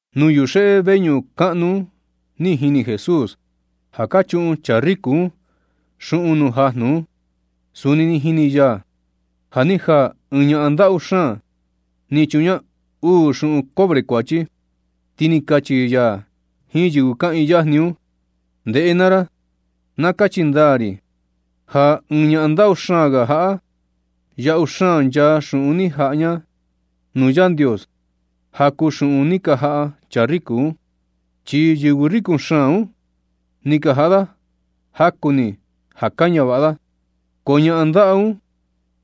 Nuu yuxeꞌe veñuꞌun kaꞌnu un ni jini Jesús ja ka chuꞌun chaa riku un xuꞌun nuu jajnu un. Suni ni jini ya ja ni jaa ɨɨn ñaꞌan ndaꞌu xaan ni chuꞌun ña uu xuꞌun cobre kuachi, ti ni kachi ya jiin yɨvɨ kaꞌiin yajni un: ―Ndeꞌe naa ra. Na kachi ndaa ri ja ɨɨn ñaꞌan ndaꞌu xaan ga jaꞌa, yaꞌu xaan nchaa xuꞌun ni jaꞌa ña un nuu Yandios ja kuu xuꞌun ni ka jaꞌa chaa riku un. Chi yɨvɨ riku xaan un, ni ka jaꞌa da jaku ni ja ka ñavaꞌa da. Ko ñaꞌan ndaꞌu un,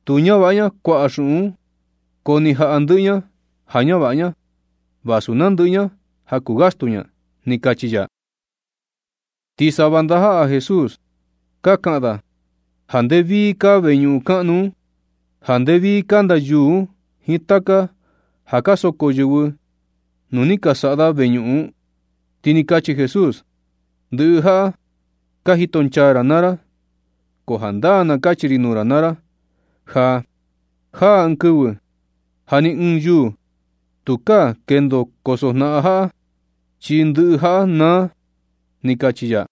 tu ñavaꞌa kuaꞌa ña xuꞌun, ko ni jaꞌa ndɨꞌɨ ña ja ñavaꞌa ña, vasu nandɨꞌɨ ña ja kuu gastu ña ―ni kachi ya. Ti sava ndajaꞌa Jesús ka kaꞌan da ja nde vii kaa veñuꞌun kaꞌnu un, ja nde vii kanda yuu un jiin taka ja ni ka soko yɨvɨ nu ni ka saꞌa da veñuꞌun un. Ti ni kachi Jesús: ―Ndɨꞌɨ jaꞌa ka jitonchaa ra naa ra. Ko jandaa na kachi ri nuu ra naa ra ja, jaa ɨɨn kɨvɨ ja ni ɨɨn yuu tukaa kendo koso jnaꞌan jaꞌa, chi ndɨꞌɨ jaꞌa naa ―ni kachi ya.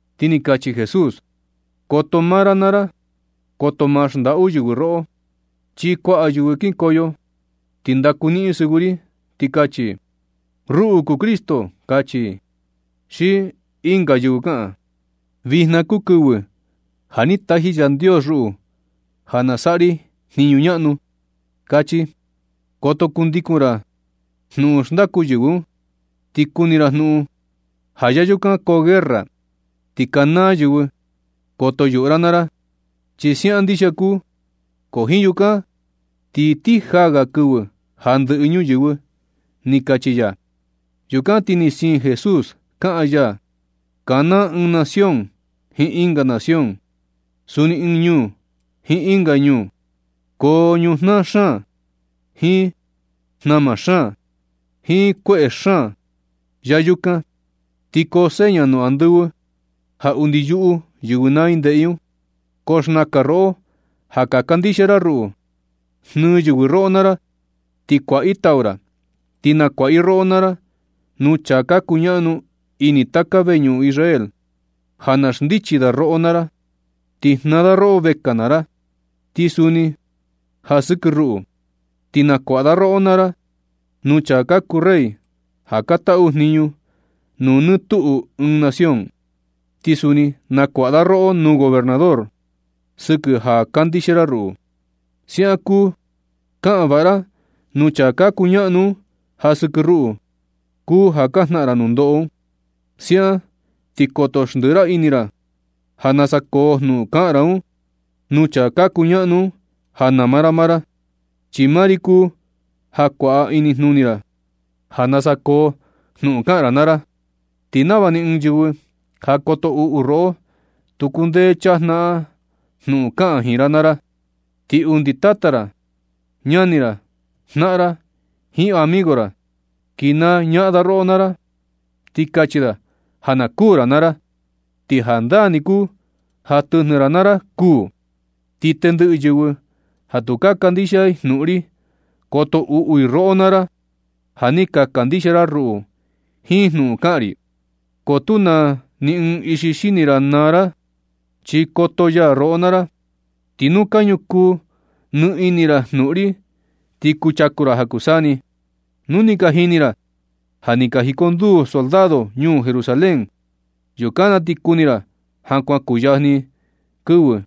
Ti ni kachi Jesús: ―Koto maa ra naa ra. Koto ma xndaꞌu yɨvɨ roꞌo. Chi kuaꞌa yɨvɨ kikoyo, ti ndaku niꞌin yɨ sɨvɨ ri, ti kachi: “Ruꞌu kuu Cristo”, kachi i. Xi ɨnga yɨvɨ kaꞌan: “Vijna kuu kɨvɨ ja ni taji Yandios ruꞌu ja saꞌa ri jniñu ñaꞌnu”, kachi. Koto kundikun ra jnuꞌun xndaku yɨvɨ un. Ti kuni ra jnuꞌun ja ya yukan koo guerra, ti kanaa yɨvɨ. Koto yuꞌu ra naa ra, chi siaꞌan ndixia kuu. Ko jiin yukan ti ni ti jaa ga kɨvɨ ja ndɨꞌɨ ñuyɨvɨ ―ni kachi ya. Yukan ti ni siin Jesús kaꞌan ya: ―Kanaa ɨɨn nación jiin ɨnga nación, suni ɨɨn ñuu jiin ɨnga ñuu. Koo ñujnaa xaan, jiin jnama xaan, jiin kueꞌe xaan ya yukan. Ti koo seña nuu andɨvɨ ja undi yuꞌu yɨvɨ naa i ndeꞌe i un. Ko xnakan roꞌo ja ka kandixia ra ruꞌu, jnɨɨ yɨvɨ roꞌo naa ra, ti kuaꞌa i tau ra. Ti nakuaꞌa i roꞌo naa ra nuu chaa ka kuñaꞌnu ini taka veñuꞌun Israel, ja na xndichi da roꞌo naa ra, ti jnaa da roꞌo vekaa naa ra. Ti suni ja sɨkɨ ruꞌu, ti nakuaꞌa da roꞌo naa ra nuu chaa ka kuu rey ja ka taꞌu jniñu nuu nɨ tuꞌu ɨɨn nación, ti suni na kuaꞌa da roꞌo nuu gobernador sɨkɨ ja ka kandixia ra ruꞌu. Siaꞌan kuu kaꞌan vaꞌa ra nuu chaa ka kuñaꞌnu un, ja sɨkɨ ruꞌu kuu ja ka jnaꞌan ra nundoꞌo. Siaꞌan ti koto xndiꞌi ra ini ra ja nasa koo jnuꞌun kaꞌan ra nuu chaa ka kuñaꞌnu un ja nama ra maa ra. Chi maa ri kuu ja kuaꞌa inijnuni ra ja nasa koo jnuꞌun kaꞌan ra naa ra, ti nava ni ɨɨn yɨvɨ ja koto uꞌu roꞌo tu kundee chajnaꞌan jnuꞌun kaꞌan jiin ra naa ra. Ti undi tata ra, ñani ra, jnaꞌan ra, jiin amigo ra kinaa ñaꞌan da roꞌo naa ra, ti kachi da ja na kuū ra naa ra. Ti jandaa ni kuu ja tɨjnɨ ra naa ra kuū. Ti tendɨꞌɨ yɨvɨ ja tu ka kandixia i jnuꞌun ri, koto uꞌu i roꞌo naa ra ja ni ka kandixia ra ruꞌu jiin jnuꞌun kaꞌan ri. Ko tu naa ni ɨɨn ixi xini ra naa ra, chi koto ya roꞌo naa ra. Ti nu ka ñukuu nɨ ini ra jnuꞌun ri, ti kuchaku ra ja kuu saa ni. ―Nu ni ka jini ra ja, ja ni ka jiconduu soldado ñuu Jerusalén, yukan na ti kuni ra ja kuan kuyajni kɨvɨ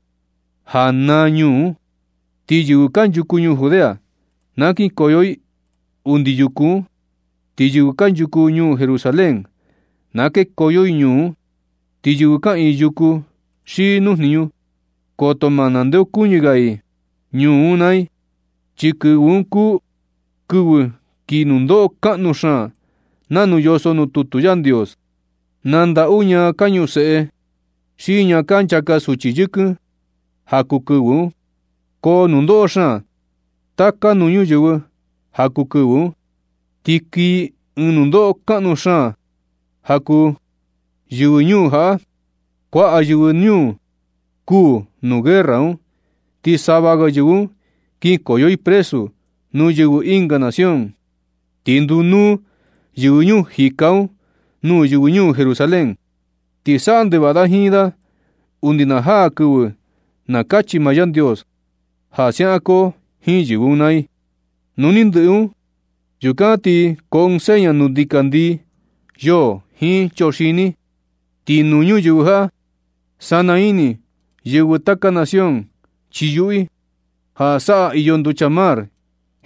ja naa ñuu un. Ti yɨvɨ kanchuku ñuu Judea, na kinkoyo i undi yuku un. Ti yɨvɨ kanchuku ñuu Jerusalén, na kekoyo i ñuu un, ti yɨvɨ kaꞌiin yuku xi nuu jniñu, koto ma ndeokuñɨ ga i ñuu un naa i. Chi kɨvɨ un kuu kɨvɨ kii nundoꞌo kaꞌnu xaan nanu yoso nuu tutu Yandios. ¡Na ndaꞌu ñaa ka ñuseꞌe xi ñaa ka nchaka suchi yɨkɨn ja kuu kɨvɨ un! Ko nundoꞌo xaan taka nuu ñuyɨvɨ ja kuu kɨvɨ un, ti kii ɨɨn nundoꞌo kaꞌnu xaan ja kuu yɨvɨ ñuu jaꞌa. Kuaꞌa yɨvɨ ñuu kuū nuu guerra un. Ti sava ga yɨvɨ un kinkoyo i presu nuu yɨvɨ ɨnga nación. Ti ndunúú yɨvɨ ñuu jika un nuu yɨvɨ ñuu Jerusalén, ti saꞌa ndevaꞌa i jiin da undi na jaa kɨvɨ na kachi maa Yandios ja siaꞌan koo jiin yɨvɨ un naa i. Nu ni ndɨꞌɨ un, yukan na ti koo ɨɨn seña nuu ndikandii, yoo, jiin choxini. Ti nuu ñuyɨvɨ jaꞌa sana ini yɨvɨ taka nación, chi yuꞌu i ja saꞌa iyo nducha mar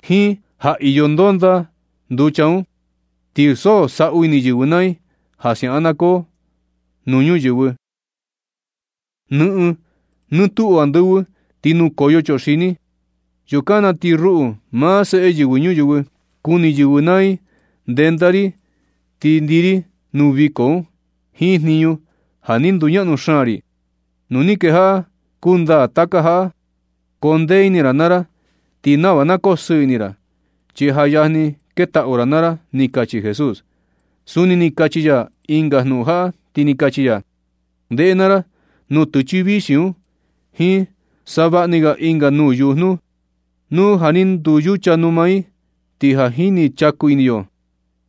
jiin ja iyo ndonda nuu nducha un. Ti so saꞌu ini yɨvɨ naa i ja siaꞌan na koo nuu ñuyɨvɨ. Nɨꞌɨn nutuꞌu andɨvɨ ti nukoyo chuxini. Yukan na ti ruꞌu, maa Seꞌe Yɨvɨ Ñuyɨvɨ, kuni yɨvɨ naa i ndenda ri, ti ndii ri nuu viko un, jiin jniñu ja ni nduñaꞌnu xaan ri. Nu ni kejaꞌa kuu ndaa taka jaꞌa, koo ndee ini naa ra ti nava na kosɨɨ ini ra, chi ja yajni ketaꞌu ra naa ra ―ni kachi Jesús. Suni ni kachi ya ɨnga jnuꞌun jaꞌa, ti ni kachi ya: ―Ndeꞌe naa ra, nutɨchɨ vixi un jiin savaꞌa ni ga ɨnga nuu yujnu, nu ja ni nduyucha numa i, ti ja ni chaku ini yo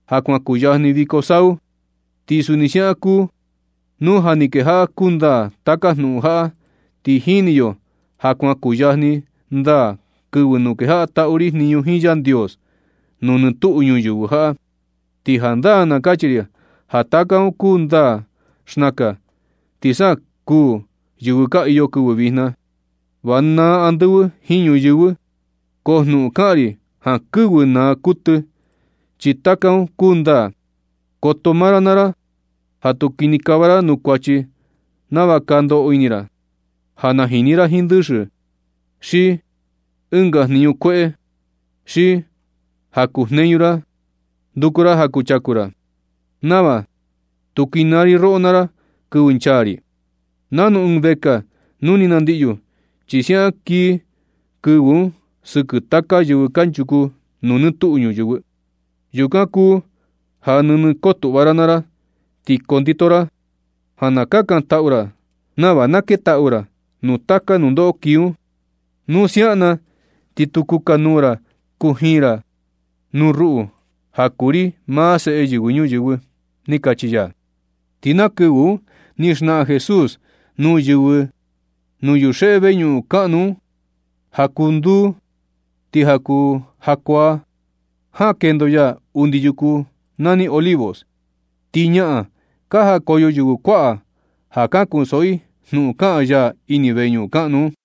ja kuan kuyajni viko sau. Ti suni siaꞌan kuu nu ja ni kejaꞌa kuu ndaa taka jnuꞌun jaꞌa, ti ni jini yo ja kuan kuyajni ndaa kɨvɨ nu kejaꞌa taꞌu ri jniñu jiin Yandios nuu nɨɨ tuꞌu ñuyɨvɨ jaꞌa. Ti jandaa na kachi ri ja taka un kuu ndaa xnakan, ti sa kuū yɨvɨ ka iyo kɨvɨ vijna. Va naa andɨvɨ jiin ñuyɨvɨ, ko jnuꞌun kaꞌan ri, jankɨvɨ naa kuɨtɨ, chi taka un kuu ndaa. Koto maa ra naa ra ja tu kinikava ra nuu kuachi nava ka ndoꞌo ini ra, ja najini ra jiin ndɨxɨ, xi ɨnga jniñu kueꞌe, xi ja kujneñu ra nduku ra ja kuchaku ra, nava tu kinaa ri roꞌo naa ra kɨvɨ nchaa ri, nanu ɨɨn vekaa nu ni nandiꞌyu. Chi siaꞌan kii kɨvɨ un sɨkɨ taka yɨvɨ kanchuku nuu nɨɨ tuꞌu ñuyɨvɨ. Yukan kuu ja nɨnɨ kotuꞌva ra naa ra, ti kondito ra ja na kakantaꞌu ra nava na ketaꞌu ra nuu taka nundoꞌo kii un. Nu siaꞌan na ti tu kukanuu ra kujiin ra nuu ruꞌu ja kuu ri maa Seꞌe Yɨvɨ Ñuyɨvɨ ―ni kachi ya. Ti na kɨvɨ un ni xnaꞌan Jesús nuu yɨvɨ nuu yuxeꞌe veñuꞌun kaꞌnu un ja kuu nduu, ti ja kuu jakuaa jaꞌan kendo ya undi yuku nani Olivos. Ti ñaꞌan ka jakoyo yɨvɨ kuaꞌa ja na kunsoꞌo i jnuꞌun kaꞌan ya ini veñuꞌun kaꞌnu un.